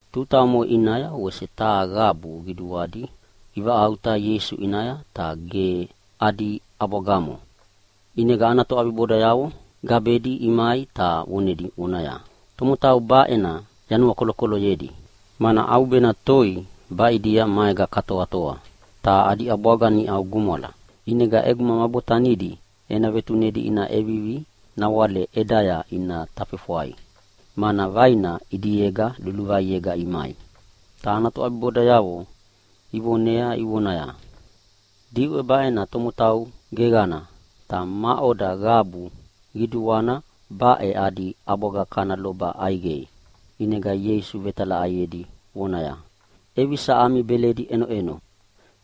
Tuta omoʼe ʼinaya wese taha qabu qiduadi ivaʼauta Ieisu ʼinaya, ta ge adi ʼabwagamo. ʼInega ana toʼabibodayavo gabedi imai ta vonedi vonaya, “Tomotau baʼena yanuakolokoloyedi, mana ʼaubena toi baʼidia maega katoatoa, ta adi ʼabwaga niʼau gumwala. ʼInega ʼeguma ma botanidi ena vetunedi ina ʼevivi nawale ʼedaya ina tafefwai, mana vaina ʼidiega luluvaiega imai.” Ta ana toʼabibodayavo ivonea ivonaya, “Diʼwe baʼena tomotau geqana ta maʼoda qabu qiduana baʼe adi ʼabwaga kana loba ʼaiqei?” ʼInega Ieisu vetalaʼaiedi vonaya, “ʼEvisa ami beledi ʼenoʼeno?”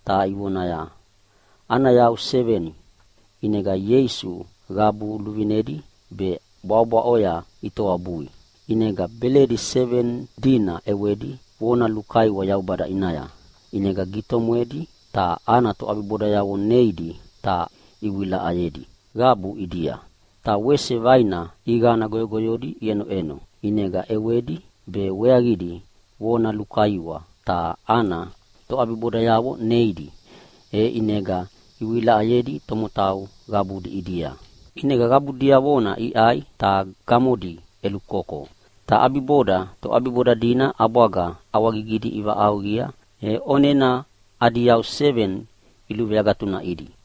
Ta ivoneaya, “Ana yau seveni.” ʼInega Ieisu qabu luvinedi be bwaʼobwaʼoya itoabui. ʼInega beledi seveni dina ʼewedi vona lukaiwa Yaubada ʼinaya. ʼInega gitomwedi ta ana toʼabibodayavo neidi ta ivewilaʼayedi qabu ʼidia. Ta wese vaina ʼiqana goyogoyodi iʼenoʼeno, ʼinega ʼewedi be weaqidi vona lukaiwa ta ana toʼabibodayavo neidi, e ʼinega ivewilaʼayedi tomotau qabudi ʼidia. ʼInega qabu diavona iʼai ta gamodi ʼelukoko. Ta ʼabiboda toʼabiboda dina ʼabwaga ʼawagigidi ivaʼauqia e ʼonena adi yau seveni iluveagatunaʼidi.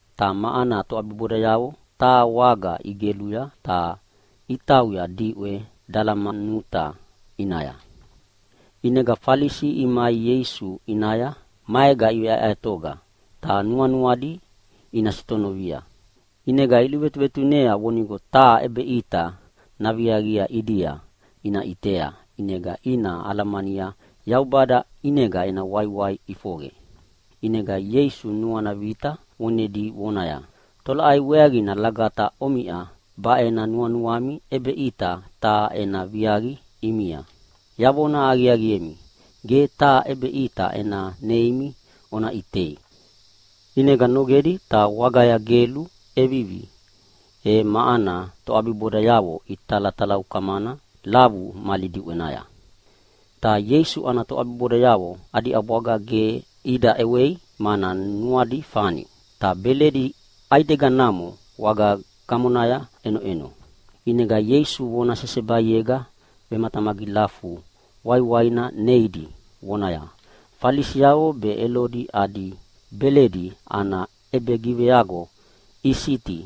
ta ma ana toʼabibodayavo taha waga igeluya, ta itauya diʼwe Dalamanuta ʼinaya. ʼInega Falisi imai Ieisu ʼinaya maega iveʼaeʼaetoga ta nuanuadi ina sitonovia. ʼInega iluvetuvetunea vonigo taha ʼebeʼita naviaqia ʼidia ina ʼitea ʼinega ina alamania Yaubada ʼinega ena waiwai ʼifoqe. ʼInega Ieisu nuana vita vonedi vonaya, “Tolaʼai weaqina lagata omiʼa baʼe nuanuami ʼebeʼita taha ena viaqi ʼimia? Yavona aqiaqiemi, ge taha ʼebeʼita ena neimi ona ʼitei.” ʼInega nogedi ta wagaya gelu ʼevivi, e ma ana toʼabibodayavo italatalaukamana lavu mali diʼwenaya. Ta Ieisu ana toʼabibodayavo adi ʼabwaga ge ida ʼewei mana nuadi fani, ta beledi ʼaideganamo waga gamonaya ʼenoʼeno. ʼInega Ieisu vona sesebaiega vematamagilafu waiwaina neidi vonaya, “Falisiavo be Elodi adi beledi ana ʼebegiveago isiti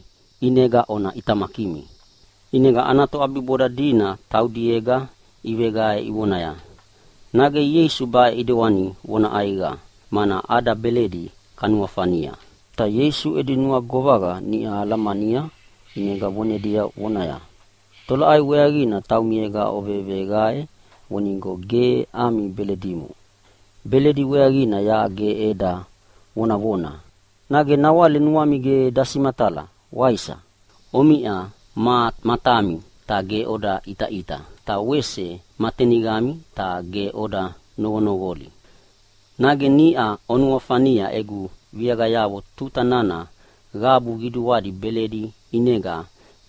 ʼinega ona ʼitamakimi!” ʼInega toʼabiboda dina taudiega iveqae ivonaya, “Nage Ieisu baʼe ʼidewani vona ʼaiqa, mana ada beledi kanuafania?” Ta Ieisu edi nuagovaqa niʼa alamania ʼinega vonedi vonaya, “Tolaʼai weaqina taumiega oveveqae vonigo ge ami beledimo? Beledi weaqina yaʼa ge eda vonavona. Nage nawale nuami ge dasimatala, waisa? Omiʼa ma matami ta ge oda ʼitaʼita, ta wese ma teniqami ta ge oda noqonoqoli! Nage niʼa ovenuafania egu viaqayavo tuta nana qabu qiduadi beledi ʼinega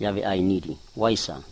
yaveʼainidi, waisa?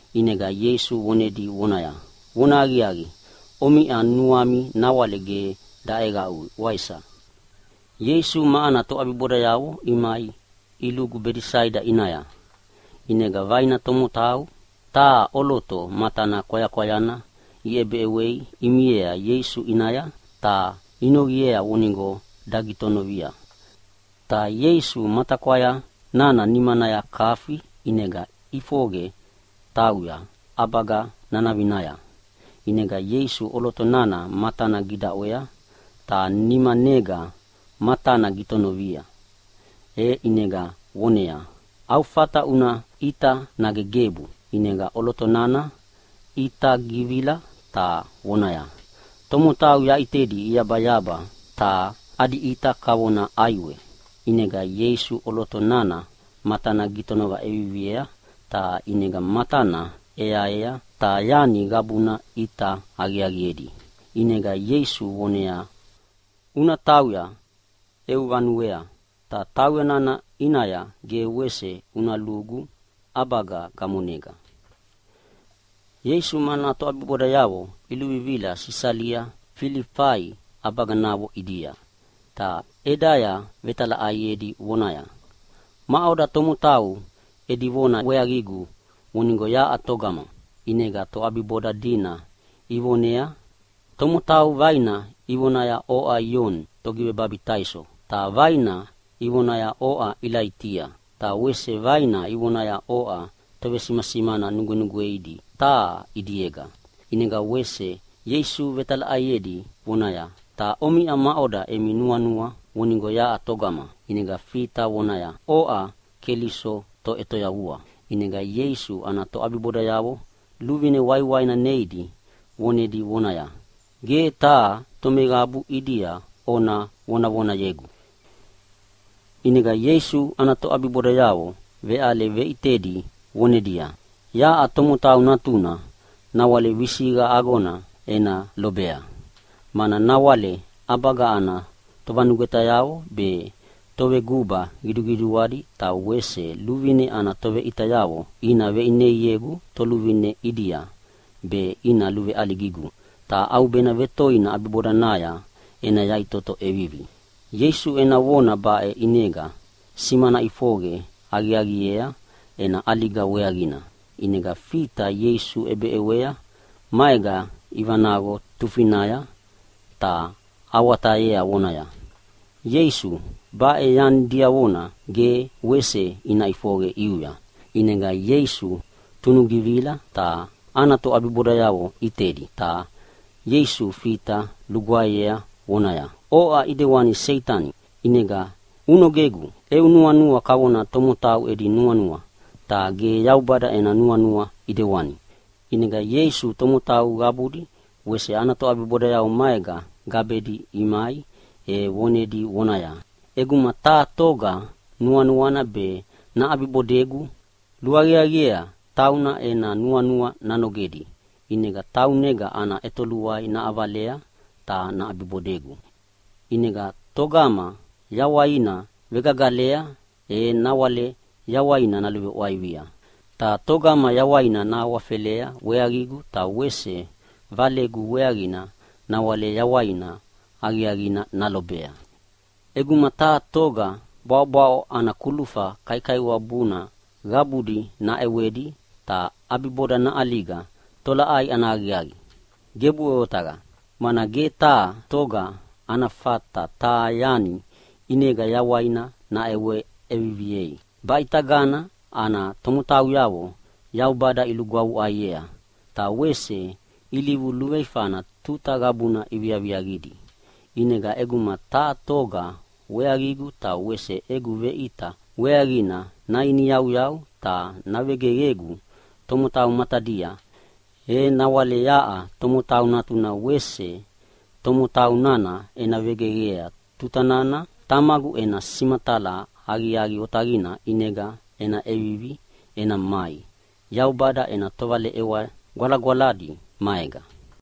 ʼInega Ieisu vonedi vonaya, “Vonahaqiaqi, omiʼa nuami nawale ge daʼeqaʼuya, waisa?” Ieisu ma ana toʼabibodayavo imai ilugu Bedesaida ʼinaya. ʼInega vaina tomotau taha ʼoloto matana kwayakwayana iʼebeʼewei imiea Ieisu ʼinaya, ta inoqiea vonigo dagitonovia. Ta Ieisu matakwaya nana nimanaya kafi ʼinega iʼifoqe itauya ʼabaga nanavinaya. ʼInega Ieisu ʼoloto nana matana gidaʼwea ta nimanega matana gitonovia, e ʼinega voneaya, “Au fata una ʼita nage gebu?” ʼInega ʼoloto nana ʼita givigivila ta vonaya, “Tomotau yaʼitedi iyabayaba ta adi ʼita kavona ʼaiwe.” ʼInega Ieisu ʼoloto nana matana gitonova ʼeviviea, ta ʼinega matana ʼeaea ta yani qabuna ʼita aqiaqiedi. ʼInega Ieisu voneaya, “Una tauya eu vanuea, ta tauya nana ʼinaya ge wese una lugu ʼabaga gamonega!” Ieisu ma ana toʼabibodayavo iluvivila Sisalia Filifai ʼabaganavo ʼidia. Ta ʼedaya vetalaʼaiedi vonaya, “Maʼoda tomotau edi vona weaqigu vonigo yaʼa toga?” ʼInega toʼabiboda dina ivoneaya, “Tomotau vaina ivonaya oʼa Ioni Togivebabitaiso. Ta vaina ivonaya oʼa Ilaitia. Ta wese vaina ivonaya oʼa tovesimasimana nugwenugweidi taha ʼidiega.” ʼInega wese Ieisu vetalaʼaiedi vonaya, “Ta omiʼa maʼoda emi nuanua vonigo yaʼa toga?” ʼInega Fita vona ʼeviviea vonaya, “Oʼa Keliso Toʼetoyavua.” ʼInega Ieisu ana toʼabibodayavo luvine waiwaina neidi vonedi vonaya, “Ge taha tomeqabu ʼidia ona vevonavonayegu!” ʼInega Ieisu ana toʼabibodayavo veʼale veʼitedi vonedia, “Yaʼa Tomotau Natuna nawale visiqa agona ena lobea. Mana nawale ʼabaga ana tovanugwetayavo be toveguba qiduqiduadi ta wese luvine ana toveʼitayavo ina veʼineiegu toluvine ʼidia be ina luveʼaligigu. Ta ʼaubena toi ʼabibodanaya ena yaʼitoto ʼevivi.” Ieisu ena vona baʼe ʼinega simana ʼifoqe aqiaqiea ena ʼaliga weaqina. ʼInega Fita Ieisu ʼebeʼewei maega ivanaqo tufinaya ta awatayea vonaya, “Ieisu, baʼe yani diavona ge wese naʼifoqe ʼiuya.” ʼInega Ieisu tunugivila ta ana toʼabibodayavo ʼitedi, ta Ieisu Fita lugwaeyea voneaya, “Oʼa ʼidewani Seitani, ʼinega unogegu! Eu nuanua kavona tomotau edi nuanua, ta ge Yaubada ena nuanua ʼidewani.” ʼInega Ieisu tomotau qabudi wese ana toʼabibodayavo maega gabedi imai e vonedi vonaya, “ʼEguma taha toga nuanuana be naʼabibodegu, luaqiaqiea tauna ena nuanua nanogedi ʼinega taunega ana ʼetoluai naʼavalea ta naʼabibodegu. ʼInega togama yawaina navegagalea e nawale yawaina naluveʼwaivia, ta togama yawaina nahawafelea weaqigu ta wese Valegu weaqina nawale yawai aqiaqina nalobea. ʼEguma taha toga bwaʼobwaʼo ana kulufa kaikaiwabuna qabudi naʼewedi ta ʼabiboda naʼaliga, tolaʼai ana aqiaqina? Gebuʼe otaqa! Mana ge taha toga ana fata taha yani ʼinega yawaina naʼewa ʼeviviei. Baʼitagana ana tomotauyavo Yaubada ilugwavuʼaiea ta wese ilivu luveifana tuta qabuna iviaviaqidi. ʼInega ʼeguma taha toga weaqigu ta wese egu veʼita weaqina nainiyauyau ta navegeqegu tomotau matadia, e nawale yaʼa Tomotau Natuna wese tomotau nana ena vegeqea tuta nana Tamagu ena simatala aqiaqi otaqina ʼinega ena ʼevivi ena mai Yaubada ena tovaleʼewa gwalagwaladi maega.”